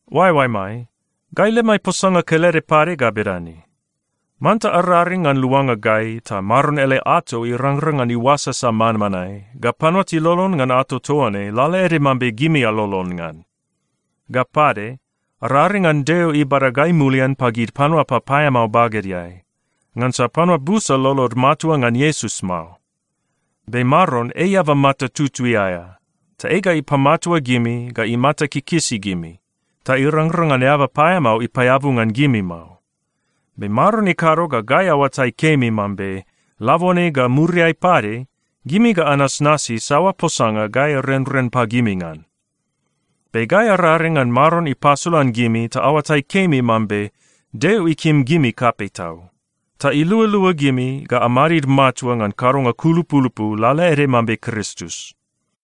Oaeoaemai, gai lemai posanga kelede pade ga bedane: Manta araring ngan luanga gai ta Maron ele ato irangrang ngan iuasasa manmanae, ga panua tilolon ngan ato toa ne lalaede mambe gimi alolon ngan. Ga pade, araring ngan Deo ibada gai mulian pagid panua papaeamao bagedeai, ngansa panua busa lolod matua ngan Iesus mao. Be Maron ei eaba mata tutui aea, ta ei ga ipamatua gimi ga imata kikisi gimi, ta irangrang ngan eaba paeamao ipaeabu ngan gimi mao. Be Maron ikado ga gai aoatai kemi mambe labone ga muriai pade, gimi ga anasnasi saoa posanga gai arenren pagimi ngan. Be gai araring ngan Maron ipasolan gimi ta aoatai kemi mambe Deo ikim gimi kapei tau, ta ilualua gimi ga amadid matua ngan kadonga kulupulupu, lalaede mambe Kristus.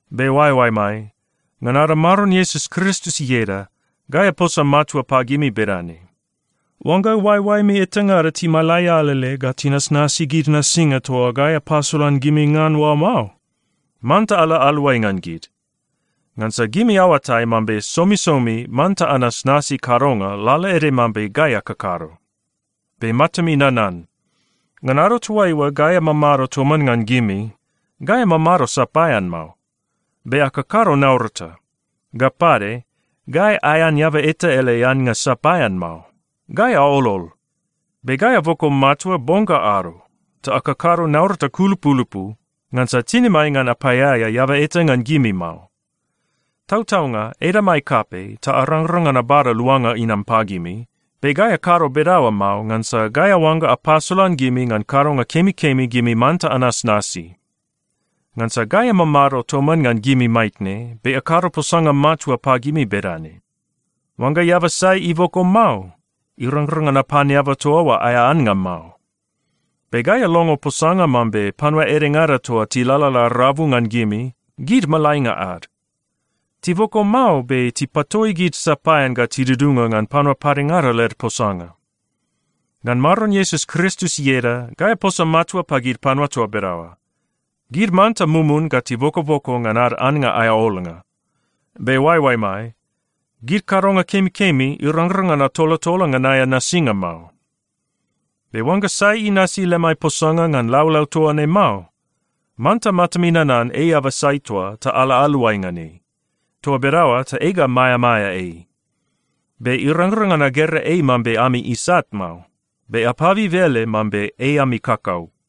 Be oaeoaemai, ngan ada Maron Iesus Kristus ieda, gai aposa matua pagimi bedane: Oangga oaeoaemi etangada timalai alele ga tinasnasi gid nasinga toa gai apasolan gimi ngan oa mao, manta ala aluai ngan gid. Ngansa gimi aoatai mambe somisomi manta anasnasi kadonga lalaede mambe gai akakado. Be matami nanan: Ngan ado toaiua gai amamado toman ngan gimi, gai amamado sapaean mao, be akakado naurata. Ga pade, gai aean eaba eta ele annga sapaean mao. Gai aolol. Be gai aboko matua bong ga ado, ta akakado naurata kulupulupu, ngansa tinimai ngan apaeaea eaba eta ngan gimi mao. Tautaunga, edamai kapei ta arangrang ngan abada luanga inam pagimi, be gai akado bedaoa mao ngansa gai aoangga apasolan gimi ngan kadonga kemikemi gimi manta anasnasi. Ngansa gai amamado toman ngan gimi maitne, be akado posanga matua pagimi bedane: Oangga eaba sai iboko mao, irangrang ngan apan eaba toa oa aea annga mao. Be gai alongo posanga mambe panua edengada toa tilalala rabu ngan gimi, gid malainga ad. Tiboko mao, be tipatoi gid sapaean ga tidudunga ngan panua padengada led posanga. Ngan Maron Iesus Kristus ieda, gai aposa matua pagid panua toa bedaoa: Gid manta mumun ga tibokoboko ngan ad annga aea olnga. Be oaeoaemai, gid kadonga kemikemi, irangrang ngan atolatola ngan aea nasinga mao. Be oangga sai inasi lemai posanga ngan laulau toa ne mao, manta matami nanan ei eaba sai toa ta ala aluai ngan ei. Toa bedaoa ta ei ga maeamaea ei. Be irangrang ngan agera ei mambe ami isat mao, be apabib ele mambe ei ami kakau.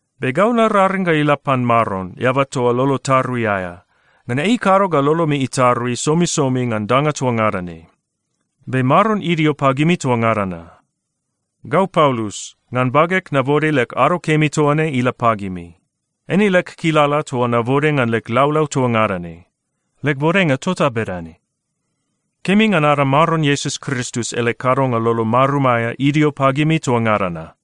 Be gau nararing ga ila pan Maron, eaba toa lolo tarui aea, ngan ei ikado ga lolomi itarui somisomi ngan danga toa ngada ne. Be Maron idio pagimi toa ngada na. Gau Paulus, ngan bageg nabode leg ado kemi toa ne ila pagimi. Eine leg kilala toa nabode ngan leg laulau toa ngada ne. Leg bodenga tota bedane. Kemi ngan ada Maron Iesus Kristus ele kadonga lolo marum aea idio pagimi toa ngada na.